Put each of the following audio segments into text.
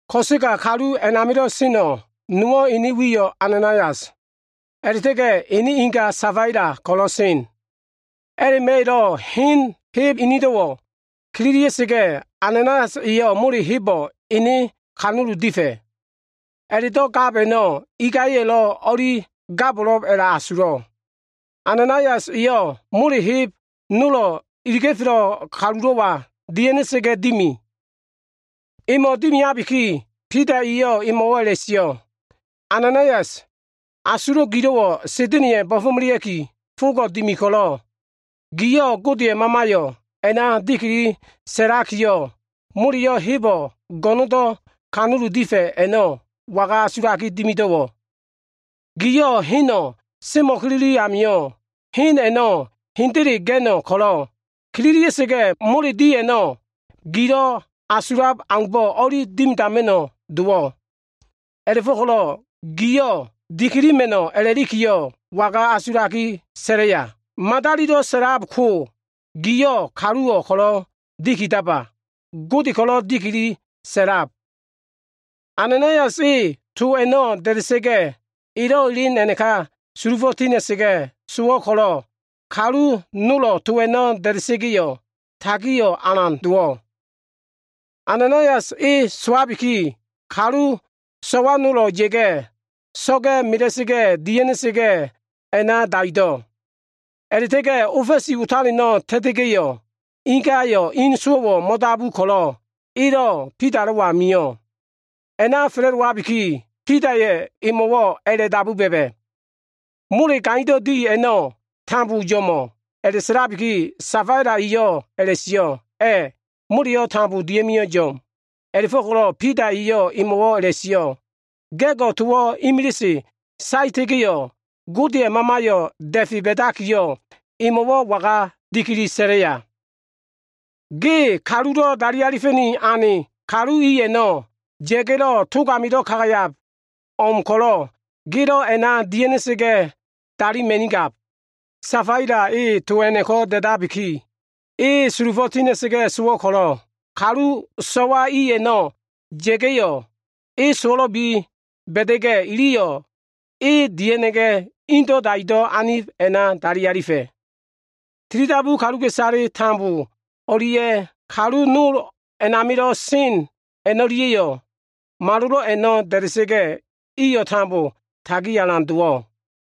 Ko꞉sega kalu a꞉namilo꞉ seno꞉ nowo꞉ ene wiyo꞉ Ananaias, a꞉la꞉ta꞉ga꞉ ene ingayo꞉ Safaila ko꞉lo꞉ sen. A꞉la꞉ma꞉yo꞉lo꞉ hen heb inido꞉wo꞉ kililia꞉sa꞉ga꞉yo꞉, Ananaias eyo꞉ mole hebo꞉ ene kanulu difa꞉. A꞉la꞉do꞉ gab a꞉no꞉ ingaya꞉yo꞉lo꞉ o꞉li gabo꞉lo꞉b a꞉la꞉asulo꞉. Ananaias eyo꞉ mole heb nolo꞉ iliga꞉felo꞉ kalulo꞉wa dia꞉ha꞉na꞉ga꞉ dimi. Emo꞉ dimiabiki, Bida eyo꞉ emo꞉wo꞉ a꞉la꞉sio꞉, “Ananaias, asulo꞉ gilo꞉wo꞉ Sa꞉da꞉na꞉ya꞉ bo꞉fo꞉melea꞉ki fogo꞉ dimi ko꞉lo꞉, giyo꞉ Godeya꞉ Mamayo꞉ a꞉na dikili sa꞉lakiyo꞉, moleyo꞉ hebo꞉ go꞉no꞉ndo꞉ kanulu difa꞉ a꞉no꞉, waga asulaki dimido꞉wo꞉? Giyo꞉ heno꞉ semo꞉kilili amio꞉, hen a꞉no꞉ hendele ga꞉no꞉ ko꞉lo꞉, kililia꞉sa꞉ga꞉ mole di a꞉no꞉ gilo꞉ asulab aumbo꞉ o꞉li dimidama꞉no꞉ dowo꞉. A꞉la꞉fo꞉ko꞉lo꞉, giyo꞉ dikilima꞉no꞉ a꞉la꞉likiyo꞉ waga asulaki sa꞉laya? Madalilo꞉ sa꞉lab ko, giyo꞉ kaluwo꞉ ko꞉lo꞉ dikidaba. Godeyo꞉ ko꞉lo꞉ dikili sa꞉lab.” Ananaias e to a꞉no꞉ da꞉da꞉sa꞉ga꞉, elo꞉ elen a꞉naka sulufo꞉ tina꞉sa꞉ga꞉ sowo꞉ ko꞉lo꞉, kalu nolo꞉ to a꞉no꞉ da꞉da꞉sa꞉ga꞉yo꞉, tagio꞉ alan dowo꞉. Ananaias e sowabiki, kalu so꞉wa nolo꞉ ya꞉ga꞉, so꞉ga꞉ mela꞉sa꞉ga꞉ dia꞉ha꞉na꞉ga꞉ a꞉na daido꞉. A꞉la꞉ta꞉ga꞉ ofa꞉si otaleno꞉ ta꞉ta꞉sa꞉ga꞉yo꞉, ingayo꞉ in sowo꞉wo꞉ mo꞉dabu ko꞉lo꞉, elo꞉ Bidalo꞉wa mio꞉. A꞉na fa꞉la꞉dowabiki, Bidaya꞉ emo꞉wo꞉ a꞉la꞉dabu ba꞉ba꞉, “Mole gaindo꞉ di a꞉no꞉, tambo yo꞉mo꞉?” A꞉la꞉sa꞉labiki, Safaila eyo꞉ a꞉la꞉sio꞉, “A꞉, moleyo꞉ tambo dia꞉mio꞉ yo꞉m.” A꞉la꞉fo꞉ko꞉lo꞉ Bida eyo꞉ emo꞉wo꞉ a꞉la꞉sio꞉, “Ga꞉go꞉ towo꞉ imilise saeta꞉ga꞉yo꞉, Godeya꞉ Mamayo꞉ da꞉fe ba꞉dakiyo꞉, emo꞉wo꞉ waga dikili sa꞉laya? Ge kalulo꞉ dali alifa꞉ni ane kalu i a꞉no꞉ ya꞉ga꞉lo꞉ tog amilo꞉ kagayab o꞉m ko꞉lo꞉ gelo꞉ a꞉na dia꞉ha꞉na꞉sa꞉ga꞉ dalima꞉nigab.” Safaila e to a꞉no꞉ko꞉ da꞉dabikiyo꞉, e sulufo꞉ tina꞉sa꞉ga꞉ sowo꞉ ko꞉lo꞉, kalu so꞉wa i a꞉no꞉ ya꞉ga꞉yo꞉, e sowo꞉lo꞉bi ba꞉da꞉ga꞉, iliyo꞉ e dia꞉ha꞉na꞉ga꞉ indo꞉ daido꞉ anib a꞉na dali alifa꞉. Tilidabu kaluka꞉isale o꞉lia꞉ kalu nol a꞉namilo꞉ sen a꞉no꞉lia꞉yo꞉, malolo꞉ a꞉no꞉ da꞉da꞉sa꞉ga꞉, iyo꞉ tambo tagio꞉ alan dowo꞉.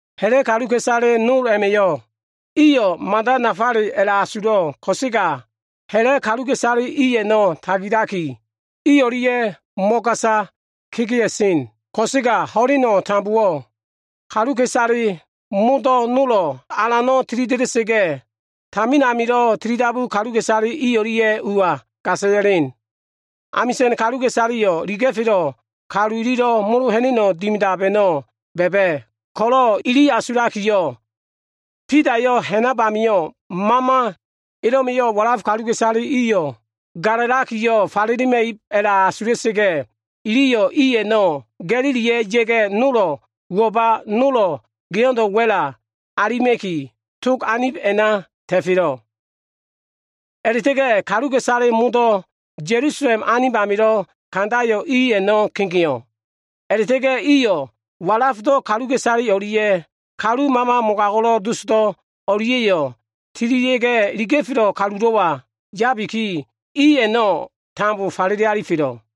Ha꞉la꞉ kaluka꞉isale nol a꞉ma꞉yo꞉ iyo꞉ mada nafale a꞉la꞉asulo꞉ ko꞉sega ha꞉la꞉ kaluka꞉isale i a꞉no꞉ tagilaki, i o꞉lia꞉yo꞉ mo꞉gasa dowa꞉sen. Ko꞉sega ho꞉leno꞉ tambowo꞉, kaluka꞉isale modo꞉ nolo꞉ Alano꞉ tilida꞉da꞉sa꞉ga꞉, tamin amilo꞉ tilidabu kaluka꞉isale i o꞉lia꞉yo꞉ ua gasa ya꞉len. Amisa꞉n kaluka꞉isaleyo꞉ iliga꞉felo꞉ kalu ililo꞉ molo ha꞉na꞉no꞉ dimida꞉lab a꞉no꞉ ba꞉ba꞉ ko꞉lo꞉, ili asulakiyo꞉, Bidayo꞉ ha꞉nab amio꞉ mama elo꞉ma꞉yo꞉ walaf kaluka꞉isale i amio꞉ ba꞉lalega falelema꞉ib a꞉la꞉asula꞉sa꞉ga꞉, iliyo꞉ i a꞉no꞉ ga꞉gililia꞉ ya꞉ga꞉, nolo꞉ uwo꞉ba, nolo꞉ geo꞉ndo꞉ wa꞉la alima꞉ki, tog anib a꞉na ta꞉felo꞉. A꞉la꞉ta꞉ga꞉ kaluka꞉isale modo꞉, Ya꞉lusalem anib amilo꞉ kandayo꞉ i a꞉no꞉ kegeo꞉. A꞉la꞉ta꞉ga꞉ iyo꞉ walafdo꞉ kaluka꞉isale o꞉lia꞉ kalu mama mogago꞉lo꞉ dosdo꞉ o꞉lia꞉yo꞉ tililia꞉ga꞉, iliga꞉felo꞉ kalulo꞉wa yabiki, i a꞉no꞉ tambo falele alifelo꞉.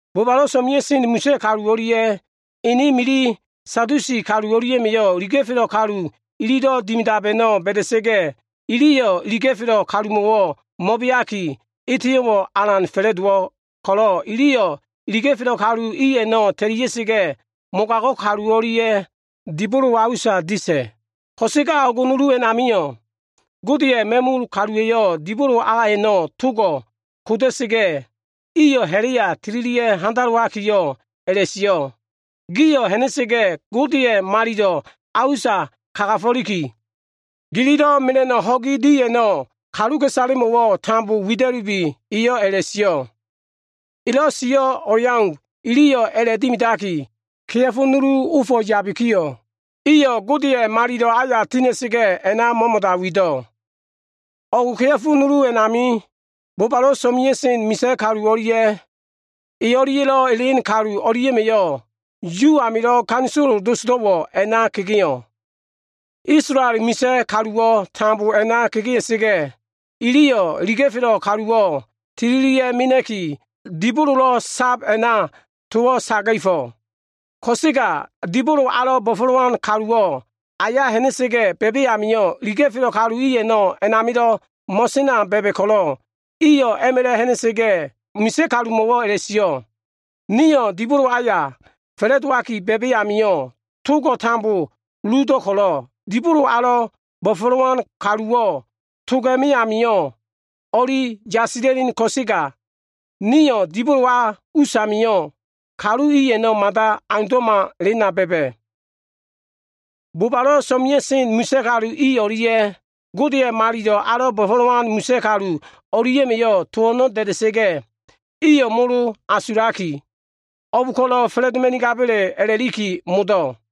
Bobalo꞉ so꞉mea꞉sen misa꞉ kalu o꞉lia꞉ ene mili, Sadusi kalu o꞉lia꞉ma꞉yo꞉ iliga꞉felo꞉ kalu ililo꞉ dimidab a꞉no꞉ ba꞉da꞉sa꞉ga꞉, iliyo꞉ iliga꞉felo꞉ kalumo꞉wo꞉ mo꞉beaki eteyo꞉wo꞉ alan fa꞉la꞉dowo꞉ ko꞉lo꞉, iliyo꞉ iliga꞉felo꞉ kalu i a꞉no꞉ ta꞉lia꞉sa꞉ga꞉, mogago꞉ kalu o꞉lia꞉ dibolo a usa disa꞉. Ko꞉sega o꞉g nulu a꞉namio꞉, Godeya꞉ ma꞉mul kaluwa꞉yo꞉ dibolo a a꞉no꞉ togo꞉ koda꞉sa꞉ga꞉, iyo꞉ ha꞉la꞉ya tililia꞉ga꞉ handalowakiyo꞉ a꞉la꞉sio꞉, “Gio꞉ ha꞉na꞉sa꞉ga꞉ Godeya꞉ malilo꞉ a usa kagafo꞉liki, gililo꞉ mela꞉no꞉ ho꞉gi di a꞉no꞉ kaluka꞉isalemo꞉wo꞉ tambo wida꞉lubi” eyo꞉ a꞉la꞉sio꞉. Elo꞉ sio꞉ o꞉leau iliyo꞉ a꞉la꞉dimidaki, kea꞉fo nulu ofo꞉ yabikiyo꞉, iyo꞉ Godeya꞉ malilo꞉ aya tina꞉sa꞉ga꞉, a꞉na mo꞉mo꞉da wido꞉. O꞉g kea꞉fo nulu a꞉namio꞉, bobalo꞉ so꞉mea꞉sen misa꞉ kalu o꞉lia꞉ e o꞉lia꞉lo꞉ elen kalu o꞉lia꞉ma꞉yo꞉, Yu amilo꞉ ganisolo dosdo꞉wo꞉ a꞉na kegeo꞉. Isolael misa꞉ kaluwo꞉ tambo a꞉na kegea꞉sa꞉ga꞉, iliyo꞉ iliga꞉felo꞉ kaluwo꞉ tililia꞉ mena꞉ki dibololo꞉ sab a꞉na towo꞉ saga꞉fo꞉. Ko꞉sega dibolo alo꞉ bo꞉fo꞉lowan kaluwo꞉ aya ha꞉na꞉sa꞉ga꞉ ba꞉ba꞉ amio꞉, iliga꞉felo꞉ kalu i a꞉no꞉ a꞉namilo꞉ mo꞉sena ba꞉ba꞉ ko꞉lo꞉, iyo꞉ a꞉ma꞉la꞉ ha꞉na꞉sa꞉ga꞉ misa꞉ kalumo꞉wo꞉ a꞉la꞉sio꞉, “Nio꞉ dibolo aya fa꞉la꞉dowaki ba꞉ba꞉ amio꞉, togo꞉ tambo uludo꞉ ko꞉lo꞉, dibolo alo꞉ bo꞉fo꞉lowan kaluwo꞉ toga꞉me amio꞉ o꞉li yasila꞉len ko꞉sega, nio꞉ dibolo a usamio꞉, kalu i a꞉no꞉ mada aundo꞉ma elena ba꞉ba꞉.” Bobalo꞉ so꞉mea꞉sen misa꞉ kalu i o꞉lia꞉ Godeya꞉ malilo꞉ alo꞉ bo꞉fo꞉lowan misa꞉ kalu o꞉lia꞉ma꞉yo꞉ to a꞉no꞉ da꞉da꞉sa꞉ga꞉, iyo꞉ molo asulakiyo꞉, o꞉b ko꞉lo꞉ fa꞉la꞉doma꞉nigaba꞉le a꞉la꞉liki modo꞉.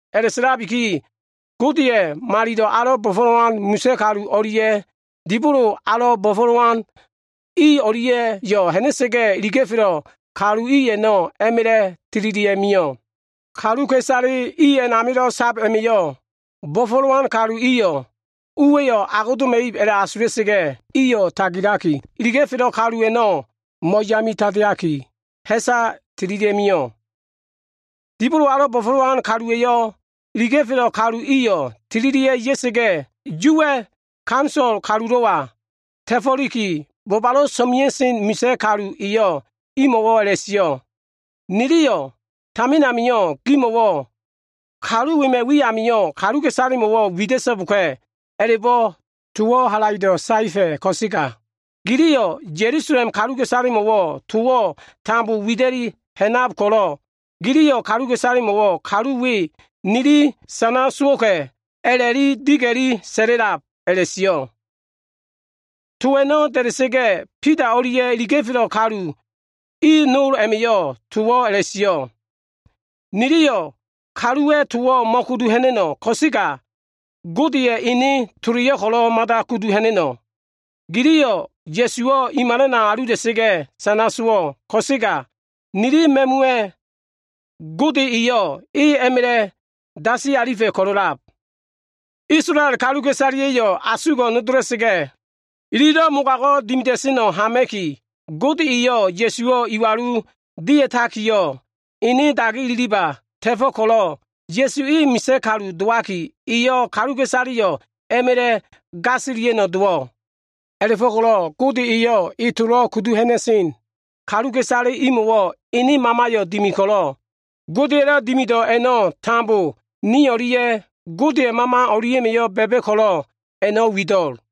A꞉la꞉sa꞉labiki, Godeya꞉ malilo꞉ alo꞉ bo꞉fo꞉lowan misa꞉ kalu o꞉lia꞉ dibolo alo꞉ bo꞉fo꞉lowan i o꞉lia꞉yo꞉ ha꞉na꞉sa꞉ga꞉, iliga꞉felo꞉ kalu i a꞉no꞉ a꞉ma꞉la꞉ tililia꞉ mio꞉. Kaluka꞉isale i a꞉namilo꞉ sab a꞉ma꞉yo꞉ bo꞉fo꞉lowan kalu iyo꞉ uwa꞉yo꞉ agodoma꞉ib a꞉la꞉asula꞉sa꞉ga꞉, iyo꞉ tagilaki, iliga꞉felo꞉ kalu a꞉no꞉ mo꞉yami tandeaki, ha꞉sa tililia꞉mio꞉. Dibolo alo꞉ bo꞉fo꞉lowan kaluwa꞉yo꞉ iliga꞉felo꞉ kalu iyo꞉ tililia꞉ ya꞉sa꞉ga꞉, Yuwa꞉ ganisolo kalulo꞉wa ta꞉fo꞉liki, bobalo꞉ so꞉mea꞉sen misa꞉ kalu eyo꞉ imo꞉wo꞉ a꞉la꞉sio꞉, “Niliyo꞉ tamin amio꞉ gimo꞉wo꞉ ‘kalu wema꞉ wi amio꞉ kaluka꞉isalemo꞉wo꞉ wida꞉so꞉boka꞉’ a꞉la꞉bo꞉ towo꞉ halaido꞉ saefa꞉ ko꞉sega, giliyo꞉ Ya꞉lusalem kaluka꞉isalemo꞉wo꞉ towo꞉ tambo wida꞉li ha꞉nab ko꞉lo꞉, giliyo꞉ kaluka꞉isalemo꞉wo꞉ ‘kalu we nili sana sowo꞉ka꞉’ a꞉la꞉li diga꞉li sa꞉la꞉lab” a꞉la꞉sio꞉. To a꞉no꞉ da꞉da꞉sa꞉ga꞉, Bida o꞉lia꞉ iliga꞉felo꞉ kalu i nol a꞉ma꞉yo꞉ towo꞉ a꞉la꞉sio꞉, “Niliyo꞉ kaluwa꞉ towo꞉ mo꞉kudu ha꞉na꞉no꞉ ko꞉sega, Godeya꞉ Ene toleyo꞉ ko꞉lo꞉ mada kudu ha꞉na꞉no꞉. Giliyo꞉ Ya꞉suwo꞉ i malana alula꞉sa꞉ga꞉ sana sowo꞉ ko꞉sega, nili ma꞉muwa꞉ Gode eyo꞉ e a꞉ma꞉la꞉ dasi alifa꞉ ko꞉lo꞉lab. Isolael kaluka꞉isaleya꞉yo꞉ asugo꞉ nodola꞉sa꞉ga꞉, ililo꞉ mogago꞉ dimida꞉seno꞉ hama꞉ki, Gode eyo꞉ Ya꞉suwo꞉ iwalu dia꞉takiyo꞉, ene dagi ililiba ta꞉fo꞉ ko꞉lo꞉, Ya꞉su e misa꞉ kalu dowaki, eyo꞉ kaluka꞉isaleyo꞉ a꞉ma꞉la꞉ gasilia꞉no꞉ dowo꞉. A꞉la꞉fo꞉ko꞉lo꞉ Gode eyo꞉ e tolo꞉ kudu ha꞉na꞉sen kaluka꞉isale imo꞉wo꞉ ene Mamayo꞉ dimi ko꞉lo꞉, Godeya꞉lo꞉ dimido꞉ a꞉no꞉ tambo ni o꞉lia꞉ Godeya꞉ Mama o꞉lia꞉ma꞉yo꞉ ba꞉ba꞉ ko꞉lo꞉ wido꞉l.”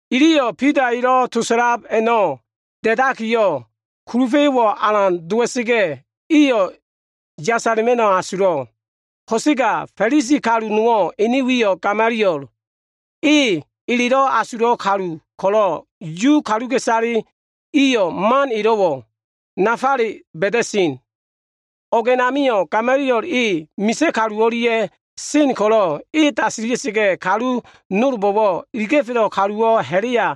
Iliyo꞉ Bida elo꞉ to sa꞉lab a꞉no꞉ da꞉dakiyo꞉, kulufa꞉yo꞉wo꞉ alan dowa꞉sa꞉ga꞉, iyo꞉ yasala꞉ma꞉no꞉ asulo꞉. Ko꞉sega Fa꞉lisi kalu nowo꞉, ene wiyo꞉ Gamaliel, e elelo꞉ widan kalu ko꞉lo꞉ Yu kaluka꞉isale iliyo꞉ man elo꞉wo꞉ nafale ba꞉da꞉sen. O꞉g a꞉namio꞉ Gamaliel e, misa꞉ kalu o꞉lia꞉ sen ko꞉lo꞉, e dasila꞉sa꞉ga꞉ kalu nolbo꞉wo꞉ “Iliga꞉felo꞉ kaluwo꞉ ha꞉la꞉ya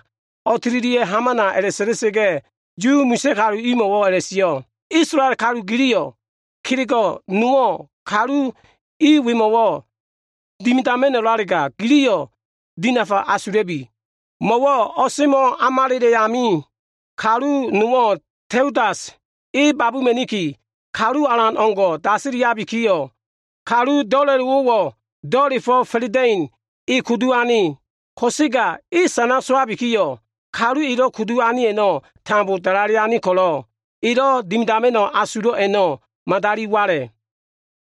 o꞉tililia꞉ hamana” a꞉la꞉sa꞉la꞉sa꞉ga꞉, Yu misa꞉ kalu imo꞉wo꞉ a꞉la꞉sio꞉, “Isolael kalu giliyo꞉, kelego꞉ nowo꞉ kalu i wemo꞉wo꞉ dimidama꞉no꞉lalega, giliyo꞉ dinafa asula꞉bi. Mo꞉wo꞉ o꞉semo꞉ amalela꞉ amio꞉, kalu nowo꞉ Teudas e babuma꞉niki, kalu alan o꞉ngo꞉ dasilabiyo꞉, kalu do꞉la꞉lowo꞉wo꞉ do꞉la꞉fo꞉ fa꞉la꞉da꞉ino꞉ e kudu ane. Ko꞉sega e sana sowabikiyo꞉, kalu elo꞉ kudu ane a꞉no꞉ tambo dalale ane ko꞉lo꞉, elo꞉ dimidama꞉no꞉ asulo꞉ a꞉no꞉ madali wala꞉.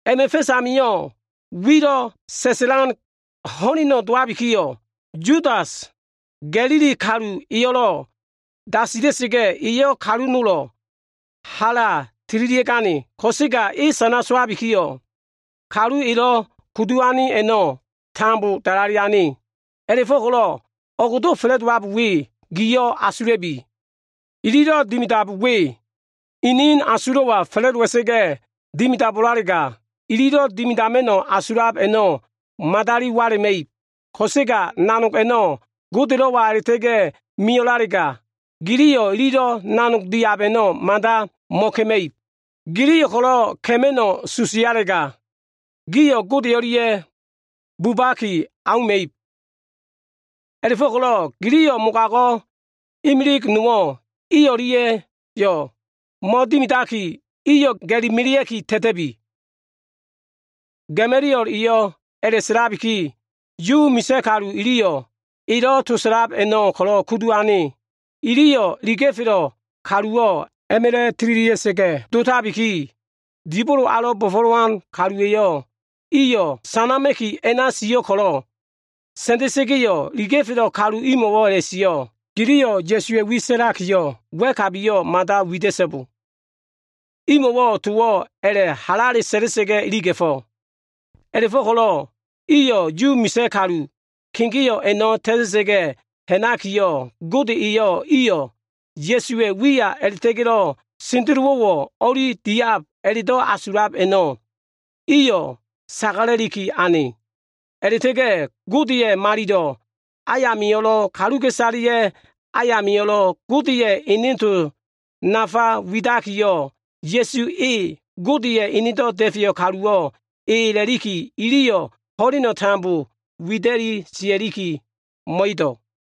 A꞉ma꞉ fa꞉s amio꞉, wilo꞉ sa꞉sa꞉lan ho꞉leno꞉ dowabikiyo꞉, Yudas, Ga꞉lili kalu eyo꞉lo꞉ dasila꞉sa꞉ga꞉, eyo꞉ kalu nolo꞉ hala tililia꞉gane ko꞉sega, e sana sowabikiyo꞉, kalu elo꞉ kudu ane a꞉no꞉ tambo dalale ane. A꞉la꞉fo꞉ko꞉lo꞉ o꞉gdo꞉ fa꞉la꞉dowab we gio꞉ asula꞉bi. Ililo꞉ dimidab we, inin asulo꞉wa fa꞉la꞉dowa꞉sa꞉ga꞉ dimidabo꞉lalega, ililo꞉ dimidama꞉no꞉ asulab a꞉no꞉ madali wala꞉ma꞉ib. Ko꞉sega nanog a꞉no꞉ Godelo꞉wa a꞉la꞉ta꞉ga꞉ mio꞉lalega, giliyo꞉ ililo꞉ nanog diab a꞉no꞉ mada mo꞉ka꞉ma꞉ib. Giliyo꞉ ko꞉lo꞉ ka꞉ma꞉no꞉ susialega, gio꞉ Gode o꞉lia꞉ bubaki auma꞉ib. A꞉la꞉fo꞉ko꞉lo꞉ giliyo꞉ mogago꞉ imili nowo꞉ i o꞉lia꞉yo꞉ mo꞉dimidaki, iyo꞉ ga꞉li melea꞉ki ta꞉ta꞉bi.” Gamaliel eyo꞉ a꞉la꞉sa꞉labiki, Yu misa꞉ kalu iliyo꞉ elo꞉ to sa꞉lab a꞉no꞉ ko꞉lo꞉ kudu ane. Iliyo꞉ iliga꞉felo꞉ kaluwo꞉ a꞉ma꞉la꞉ tililia꞉sa꞉ga꞉ dotabiki, dibolo alo꞉ bo꞉fo꞉lowan kaluwa꞉yo꞉ iyo꞉ sanama꞉ki a꞉na sio꞉ ko꞉lo꞉, sa꞉nda꞉sa꞉ga꞉yo꞉ iliga꞉felo꞉ kalu imo꞉wo꞉ a꞉la꞉sio꞉, “Giliyo꞉ Ya꞉suwa꞉ wi sa꞉lakiyo꞉, wa꞉kabiyo꞉ mada wida꞉so꞉bo.” Imo꞉wo꞉ towo꞉ a꞉la꞉ halale sa꞉la꞉sa꞉ga꞉ iliga꞉fo꞉. A꞉la꞉fo꞉ko꞉lo꞉ iyo꞉ Yu misa꞉ kalu kegeo꞉ a꞉no꞉ ta꞉ta꞉sa꞉ga꞉ ha꞉nakiyo꞉, Gode eyo꞉ iyo꞉ Ya꞉suwa꞉ wiya a꞉la꞉ta꞉ga꞉lo꞉ sendelowo꞉wo꞉ o꞉li diab a꞉la꞉do꞉ asulab a꞉no꞉, iyo꞉ sagala꞉liki ane. A꞉la꞉ta꞉ga꞉ Godeya꞉ malilo꞉ ayamio꞉lo꞉, kaluka꞉isaleya꞉ ayamio꞉lo꞉ Godeya꞉ ene to nafa widakiyo꞉, Ya꞉su e, Godeya꞉ Enedo꞉ Da꞉feyo꞉ kaluwo꞉ e a꞉la꞉liki iliyo꞉ ho꞉leno꞉ tambo wida꞉li sia꞉liki mo꞉edo꞉.